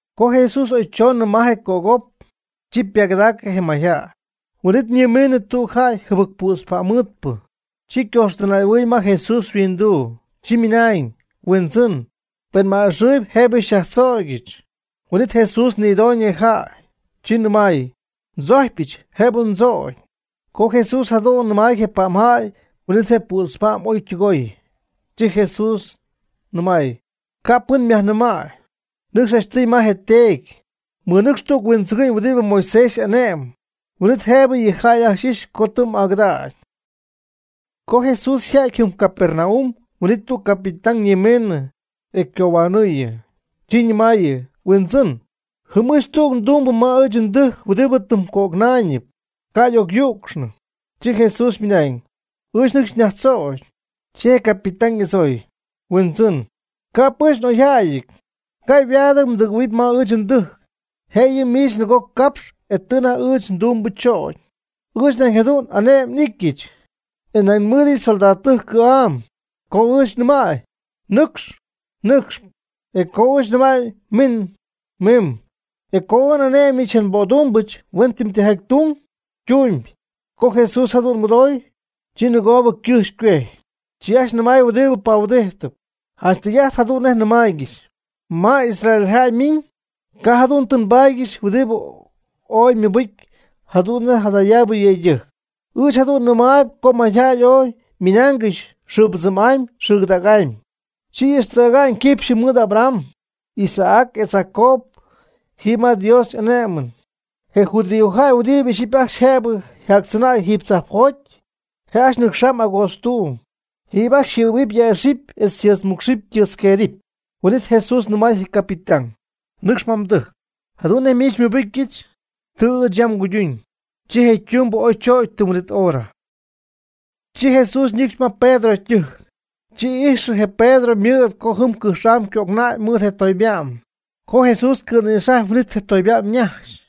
Co Jesús oy choonɨ ma je cögop, chi ypagɨdacɨ mayjäy. Huin'it ñimiinɨ tüg jäy jɨbɨc pützpa'mmɨɨdpɨ. Chi ycojxtɨnay'ahuɨɨy ma Jesús yhuinduu. Chi minañ: ―Huindzɨn, pen m'a'ixɨɨyb jëbɨ xyajtzögyɨch. Huin'it Jesús nïdooñ je jäy. Chi nɨmay: ―Ndzojcpyɨch, jëbɨ mdzögy. Co Jesús jadu'n nɨmay je pa'mjäy huin'ítɨy je ypützpa'm oy ytɨgooy. Chi Jesús nɨmay: ―Ca' pɨn myajnɨmäy; nɨcx janchtɨy ma je teedy. Mɨnɨcx tüg huindzɨgɨ'ñ huɨdi Moisés y'ane'my. Huin'it jëbɨ yɨ jäy ajcxy ixɨpy co tɨ m'agɨdägy. Co Jesús yja'ty jɨm Capernaum huin'it tüg capitán ñimiinɨ e ycohuanɨɨy. Chi ñɨmaayɨ: ―Huindzɨn, jɨm ɨɨch tüg ndumbɨ ma ɨɨch ndɨjc huɨdi tɨm cöcnaayñɨp, ca' y'ocyücxnɨ. Chi Jesús mɨnañ: ―Ɨɨch nɨcxy nyajtzögy. Chi je capitán y'adzooy: ―Huindzɨn, ca'p ɨɨch n'oyjäyɨty, ca' yhuaadɨty mdɨgɨ̈huɨpy ma ɨɨch ndɨjc, jëyɨ miich nɨgoo capxy e tɨ anajty ɨɨch ndumbɨ chögy. Ɨɨch nañ jadu'n ane'my n'ityɨch, e nañ nmɨɨdɨch soldadtɨjc cɨ̈'am. Co ɨɨch nɨmäy: “Nɨcx”, nɨcxp; e co ɨɨch nɨmäy: “Min”, mimb; e co n'ane'myɨch je nbödumbɨch huen tijaty tun, ytumyb. Co Jesús jadu'n mɨdooy, chi nɨgoobɨ ycɨjxy ycuejty. Chi ajcxy nɨmay huɨdi pahuidijtɨp: ―Janch tɨy'ajt jadu'n nej nɨmaaygɨxy, ma Israeljäy ymiñ, ca' jadu'n tɨ nbaadyɨch huɨdi oy mɨbɨcy jadu'n nej jadayaabɨ yëydɨjc. Ɨɨch jadu'n nɨmaayb co mayjäy oy miinaangɨxy xɨɨpɨdzɨmy'amy xɨɨcɨdägy'amy, chi ixtäga'ñ quipxyɨ mɨɨd Abraham, Isaac etz Jacob jiiby ma Dios y'ane'mɨn. Je judíojäy huɨdibɨ ixyipy ajcxy jëbɨ yjatzɨnäy jiiby tzajpjoty, je' ajcxy nɨcxamb agootztuuby, jiiby ajcxy yjɨ̈huɨpy yäxɨpy etz y tɨɨtzmúcxɨpy ytɨɨtzqueedɨpy. Huin'it Jesús nɨmay je capitán: ―Nɨcx ma mdɨjc. Jadu'n nej miich xymɨbɨcyɨch, tɨ ɨɨch yam nguyduñ. Chi je tumbɨ oy chögy tɨm huin'it hora. Chi Jesús ñɨcxy ma Pedro ytɨjc. Chi ijxy je Pedro ymɨ̈d co jɨm cɨjx'am ycöcnäy mɨɨd je toyba'm. Co Jesús cɨ̈nïxajy huin'it je toyba'm ñajxy.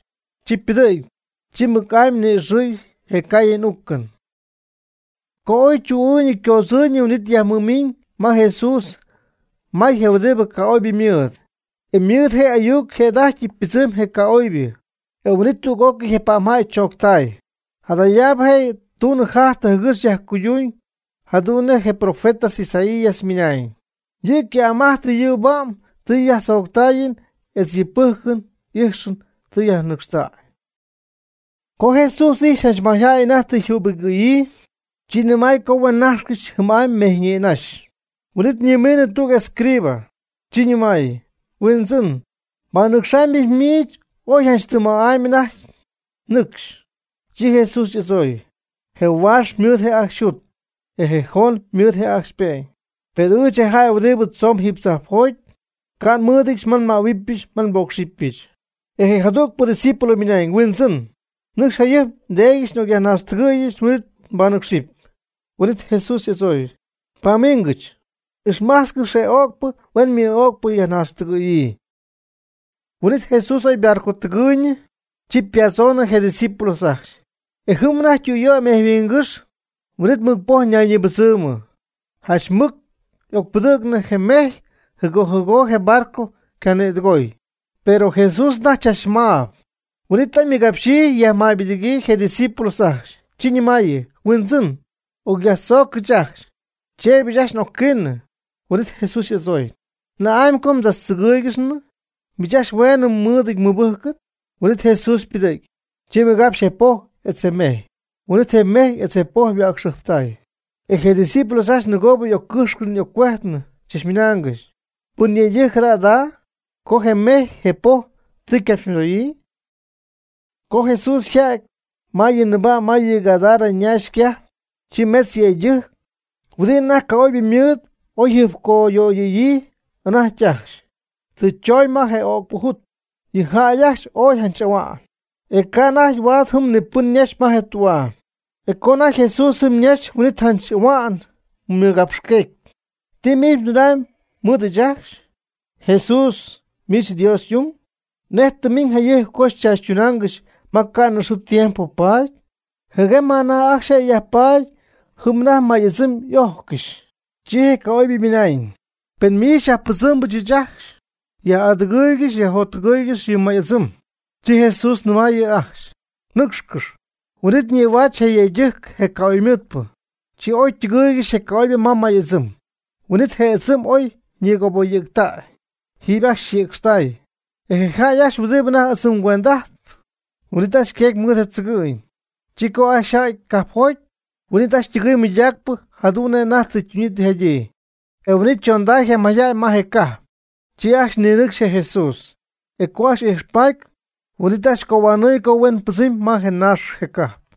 Chi pɨdɨ̈gy. Chi mɨc'amy ni'ixɨɨy je caayɨn uucɨn. Co oy chu'ɨɨyñɨ ycoodzɨɨyñɨ huin'it yajmɨmiñ ma Jesús may je huɨdi ca'oybɨ mɨɨd. E mɨɨd yɨ' y'ayuc yjëda'ajty ypɨdzɨmday je ca'oybɨ, e huin'it tüg'ócɨy je pa'mjäy chooctay. Jadayaabɨ je' ytunɨ yjajtɨ jɨgɨx yajcuyduñ jadu'n nej je profeta Isaías mɨnañ: “Yɨ' cɨ'm ajt nyuu nba'm tɨ xyajtzoctaayɨm etz yɨ pɨjcɨn ixɨn tɨ yajnɨcxtäy.” Co Jesús ijxy janch mayjäy anajty tɨ yjübigɨ̈yii, chi nɨmay co huen nájxcɨxy jɨm'amy mejy nïnaxy. Huin'it ñimiinɨ tüg escriba. Chi nɨmay: ―Huindzɨn, nbanɨcxamybɨch miich oy janch tɨm ma'amy ma anajty mnɨcxy. Chi Jesús y'adzooy: ―Je huaax ymɨɨd je' ajcxy yjut, e je joon ymɨɨd je' ajcxy ype'ñ. Per ɨɨch, je jäy huɨdibɨ tzoon jiiby tzajpjoty, ca' nmɨ́ɨdɨdyɨch ma nmähuɨbɨch ma nbócxɨbɨch. E jadügpɨ ydiscípulo ymɨnañ: ―Huindzɨn, nɨcx jayɨjp ndeedyɨch n'ocyajnaaxtɨgɨ̈yɨch huin'it nbanɨcxɨp. Huin'it Jesús y'adzooy: ―Pamiingɨch, ixmajtzcɨx yɨ öcpɨ huen ymɨɨ'öcpɨ yajnaaxtɨgɨ̈yii. Huin'it Jesús oy ybarcotɨgɨɨyñɨ. Chi ypadzoonɨ je ydiscípulos ajcxy. E jɨm anajty ytüyöy mejyhuingɨ́xy, huin'it mɨc poj ñaymɨbɨdzɨmɨ. Janch mɨc y'ocpɨdɨ̈cnɨ je mejy jɨgo jɨgo je barco cayajnïdɨgoy, pero Jesús anajty chachmaab. Huin'it oy ymɨgapxyii yajmäybɨdɨ̈gyii je' ydiscípulos ajcxy. Chi ñɨmaayɨ: ―¡Huindzɨn, ocyajtzoogɨch ajcxy! ¡Cheeby ɨɨch ajt n'ocquiinɨm! Huin'it Jesús y'adzooy: ―¿Na'amy co mdzachtzɨgɨ́ɨygɨxnɨ? ¡Miich ajcxy hueenɨ mɨɨdɨty mɨbɨjcɨn! Huin'it Jesús ypɨdɨ̈gy. Chi mɨgapxy je poj etz je mejy. Huin'it je mejy etz je poj yhua'cxɨjptay. E je' ydiscípulos ajcxy nɨgoobɨ y'occɨ́x y'occuejtnɨ chachmɨnaangɨxy: ―¿Pɨn yëydɨjc jada jada', co je mejy je poj tɨ ycapxymɨdoyii? Co Jesús yja'ty ma yɨ nɨɨba' ma yɨ Gadara ñaax ycajp, chi metz yëydɨjc, huɨdi anajty ca'oybɨ mɨɨd oy yjɨjpcoyöyɨ̈yii anajty ajcxy, tɨ chooñ ma je öcpɨ jut. Yɨ jäy ajcxy ooy janch ahua'n, e ca' anajty huaad jɨm ni pɨn ñaxy ma je tü'aa. E co anajty Jesús jɨm ñaxy huin'it janch ahua'n ymɨgapxqueecɨ: ―¿Ti miich mdunamyb mɨɨd ɨɨch ajcxy, Jesús, miich Dios y'ung? ¿Nej tɨ mmiñ jayɨjp co xychaachytúngɨxɨch ma ca'nɨ xɨɨ tiempo paady? Jɨguem ma anajty ajcxy je' yajpaady jɨm anajty may'ɨdzɨm y'ojccɨxy. Chi je ca'oybɨ ymɨnañ: ―Pen miich xyajpɨdzɨm ɨɨch ajcxy, xyaj'adɨgɨɨygɨxy xyajjottɨgɨɨygɨxy yɨ may'ɨdzɨm. Chi Jesús ñɨmay yɨ' ajcxy: ―Nɨcxcɨx. Huin'it ñïhuaatzɨ je yëydɨjc je ca'oybɨ. Chi oy ytɨgɨɨygɨxy je ca'oybɨ ma je ɨdzɨm. Huin'it je ɨdzɨm oy ñɨɨgöboyɨ̈ctäy. Jiiby ajcxy yjïcxtäy. E je jäy ajcxy huɨdibɨ anajty ɨdzɨm ycuend'ajtp, huin'it ajcxy yqueegy mɨɨd je tzɨgɨ'ñ. Chi co ajcxy yja'ty cajpjoty, huin'it ajcxy ytɨgɨɨy mɨydaacpɨ jadu'n nej anajty tɨ ytuñyii tɨ yjadyii. E huin'it chonday je mayjäy ma je cajp. Chi ajcxy ninɨcxy je Jesús. E co ajcxy ijxpaty, huin'it ajcxy cohuanɨɨy co huen pɨdzɨmnɨ ma je naax je cajp.